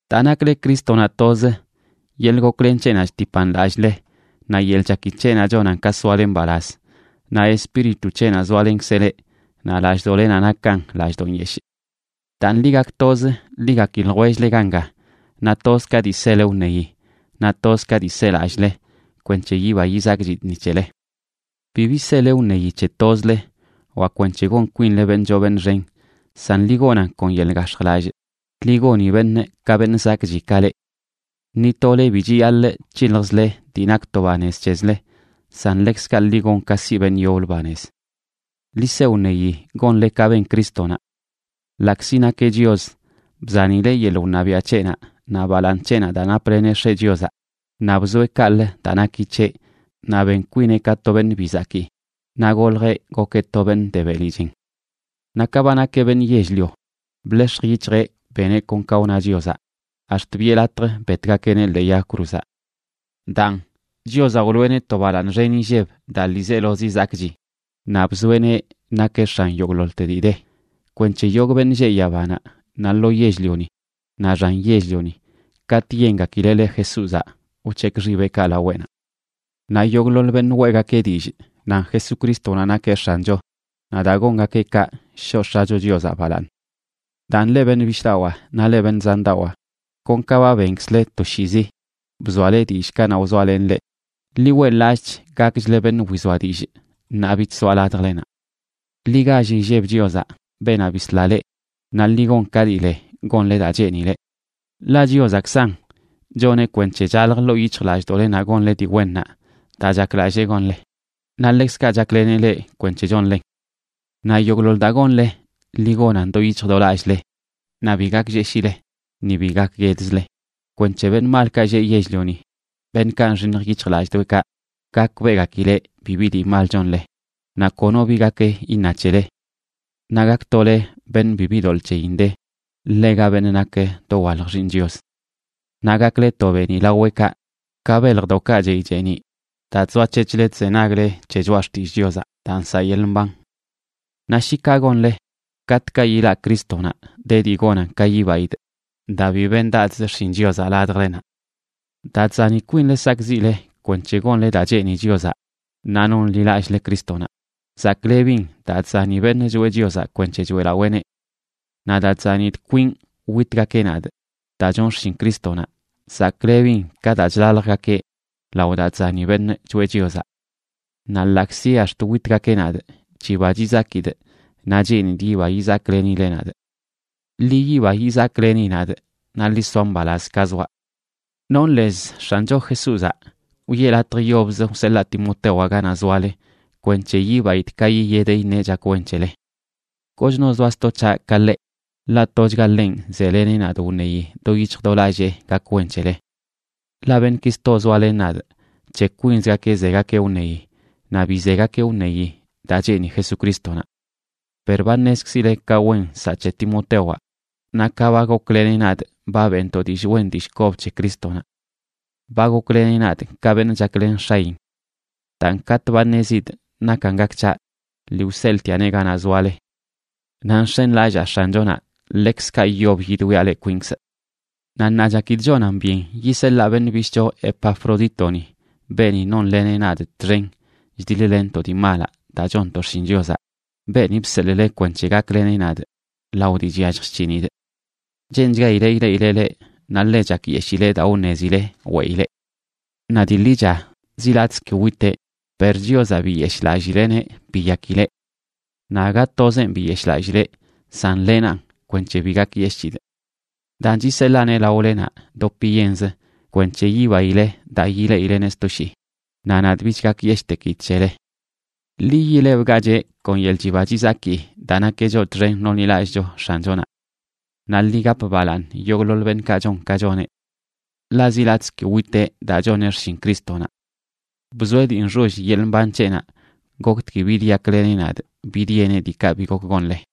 Daa nakle Crístonaꞌ toz, yeḻꞌ goklen c̱heꞌnaꞌ chtipan lallꞌle, naꞌ yeḻꞌ chaki c̱heꞌnaꞌ chonan ka soale mbalaz, naꞌ Espíritu c̱heꞌnaꞌ zoalenkzeꞌ leꞌ, naꞌ lallꞌdoꞌlenaꞌ nakan lallꞌdoꞌ yeshꞌ. Daan, ḻi gak toz, ḻi gaki ljwell-le ganga, naꞌ toz ka dii sele wṉeyi, naꞌ toz ka dii selallꞌle, kwenc̱he yiba yizakchidꞌ ni c̱hele. Bibi sele wṉeyi c̱he tozle wa kwenc̱he gon kwinle beṉꞌ choo beṉꞌ xen, san ḻi gonan kon yeḻꞌ gax̱jlallꞌ, ḻi goni beṉꞌ ka beṉꞌ zakꞌchi ka leꞌ. Ni tole bi chiyaḻꞌ c̱hiljzle dii nak to banez c̱hezle, san ḻekzkaꞌ ḻi gon ka siꞌ beṉꞌ yoblə banez. Ḻi se wṉeyi gonle ka ben Crístonaꞌ. Ḻaꞌkzi nakeꞌ Chios, bzanileꞌ yeḻꞌ wṉabiaꞌ c̱heꞌnaꞌ naꞌ balaaṉ c̱heꞌnaꞌ daa napleneꞌ X̱eꞌ Chiozaꞌ, naꞌ bzoeꞌ kaꞌlə daa naki c̱heꞌ, naꞌ ben kwineꞌ ka to beṉꞌ bi zakii, naꞌ goljeꞌ gokeꞌ to beṉꞌ de beli chen. Naꞌ ka ba nakeꞌ beṉꞌ yell-lio, bḻex̱j yic̱hjeꞌ beneꞌ kon ka wna Chiozaꞌ ax̱t biꞌe latj betgakeꞌneꞌ ḻee yag cruzaꞌ. Daan, Chiozaꞌ wloꞌeneꞌ to balaaṉ xen inlleb daa ḻiizelozi zakꞌchi, naꞌ bzoeꞌneꞌ nakeꞌ x̱an yogꞌḻoḻte dii de, kwenc̱he yogꞌ beṉꞌ lleꞌ yabanaꞌ, naꞌ lo yell-lioni, naꞌ xan yell-lioni katꞌ yengakileꞌ le Jesúzaꞌ wc̱hekꞌ xibeꞌkaꞌ laweꞌnaꞌ. Naꞌ yogꞌḻoḻ beṉꞌ weꞌgakeꞌ dillꞌ nan Jesucrístonaꞌ nakeꞌ X̱ancho naꞌ daa gongakeꞌ kaꞌ shoꞌ X̱acho Chiozaꞌ balaaṉ. Daan, leꞌ beṉꞌ bishꞌdawaa naꞌ leꞌ beṉꞌ zandawaa, kon ka ba benkzle toshiizi bzoale dillꞌ kanaꞌ wzoalenꞌ leꞌ, ḻi weꞌḻ-lallꞌch gakchle beṉꞌ wizoa dillꞌ ṉaa bich zoaꞌ ladjlenaꞌ. Ḻi gall illeb Chiozaꞌ, beenaꞌ bisla leꞌ, naꞌ ḻi gon ka dii le gonle daa cheenileꞌ. Ḻaꞌ Chiozaꞌkzan choneꞌ kwenc̱he chalj ḻoo yic̱hjlallꞌdoꞌlenaꞌ gonle dii wennaꞌ daa chaklallee gonle, naꞌ ḻekzkaꞌ chakleneꞌ leꞌ kwenc̱he chonlen. Naꞌ yogꞌḻoḻ daa gonle, ḻi gonan do yic̱hj do lallꞌle, naꞌ bi gaklleshile ni bi gakguedzle, kwenc̱he beṉꞌ malkaꞌ lleꞌ yell-lioni, beṉꞌkaꞌ nxiṉj yic̱hjlallꞌdoꞌekaꞌ, gakbeꞌgakileꞌ bibi dii mal chonle, naꞌ kono bi gak iṉa c̱hele. Naꞌ gaktole beṉꞌ bibi doḻꞌ c̱heyin de, ḻega beṉꞌ nak dowalj xiiṉ Chios. Naꞌ gakle to beeniꞌ laweꞌkaꞌ, ka beljdoꞌkaꞌ chey cheeniꞌ, daa chzoac̱hec̱hle chzenagle c̱he choꞌa xtillꞌ Chiozaꞌ daa nsaꞌ yeḻꞌ mban. Naꞌ shi kaꞌ gonle, katꞌkaꞌ yilaꞌ Crístonaꞌ de dii gonan ka yibaidꞌ daa bi bendadzꞌ xshin Chiozaꞌ ladjlenaꞌ. Daa chzani kwinle sakꞌziꞌle kwenc̱he gonle daa cheeni Chiozaꞌ ṉaa nonḻilallꞌle Crístonaꞌ, zaklebin daa chzani beṉꞌ choeꞌ Chiozaꞌ kwenc̱he choeꞌlaweeneꞌ. Naꞌ daa chzanidꞌ kwinꞌ witgakeꞌ nadꞌ daa chonꞌ xshin Crístonaꞌ, zaklebin ka daa chlaljgakeꞌ lao daa chzani beṉꞌ choeꞌ Chiozaꞌ. Naꞌ ḻaꞌkzi ax̱t witgakeꞌ nadꞌ, chiba chizakidꞌ naꞌ cheenidꞌ yiba yizaklenile nadꞌ. Ḻi yiba yizakleni nadꞌ, naꞌ ḻi soa mbalaz ka zoaꞌ. Nonꞌ lez X̱ancho Jesúzaꞌ wiꞌe latj yobzə wseḻaa Timotewaꞌ ganaꞌ zoale, kwenc̱he yibaidꞌ ka yiyedeꞌ iṉeꞌ chak wen c̱hele. Kochno zoa sto c̱haꞌ ka ḻeꞌ, ḻaꞌ tochga ḻenꞌ zeleneꞌ nadꞌ wṉeyi do yic̱hj do lallee gak wen c̱hele. Ḻaꞌ beṉꞌki sto zoalen nadꞌ, c̱he kwinzgakeꞌ zegakeꞌ wṉeyi naꞌ bi zegakeꞌ wṉeyi daa cheeni Jesucrístonaꞌ. Per ba ṉezkzile ka wen nsaꞌ c̱he Timotewaꞌ naꞌ ka ba gokleneꞌ nadꞌ ba beꞌntoꞌ dillꞌ wen dillꞌ kob c̱he Crístonaꞌ. Ba gokleneꞌ nadꞌ ka beṉꞌ chaklen x̱ayin. Daan, katꞌ ba ṉezidꞌ nakan gak c̱haꞌ, lii wseḻꞌtiaꞌneꞌ ganaꞌ zoale. Naꞌ nx̱enlallaa X̱anchonaꞌ ḻekzkaꞌ yob yidwiaꞌ leꞌ kwinkzꞌ. Naꞌ ṉaa chakidꞌ chonan byen yiseḻaa beṉꞌ bishꞌcho Epafrodítoni, beeni nonleneꞌ nadꞌ txen chdiḻ-lenntoꞌ dii malaꞌ daa chonntoꞌ xshin Chiozaꞌ, beeni bseḻꞌle kwenc̱he gakleneꞌ nadꞌ lao dii chyallj chc̱hinidꞌ. Cheenchgaileꞌ ileꞌileꞌ leꞌ, naꞌ ḻe chakyeshileꞌ daa wṉezile weꞌileꞌ. Naꞌ dii ḻicha zi latꞌzə ki witeꞌ, per Chiozaꞌ biyeshꞌlallileꞌneꞌ biyakileꞌ. Naꞌ aga tozenꞌ biyeshꞌlallileꞌ, san lenanꞌ kwenc̱he bi gakyeshꞌchidꞌ. Daan chiseḻaaneꞌ laolenaꞌ dopiyenzə kwenc̱he yibaileꞌ daa yileꞌileneꞌ sto shii, naꞌ nadꞌ bich gakyeshꞌtekidꞌ c̱hele. Ḻi yilebgacheꞌ kon yeḻꞌ chiba chizaki daa nakeꞌ choꞌ txen nonḻilallꞌcho X̱anchonaꞌ. Naꞌ ḻi gap balaaṉ yogꞌḻoḻ beṉꞌkaꞌ chon ka choneꞌ. Ḻaꞌ zi latꞌzə ki witeꞌ daa choneꞌ xshin Crístonaꞌ. Bzoeꞌ dii nxoll yeḻꞌ mban c̱heꞌnaꞌ goktgui bidyakleneꞌ nadꞌ bidyeneꞌ diikaꞌ bi gok gonle.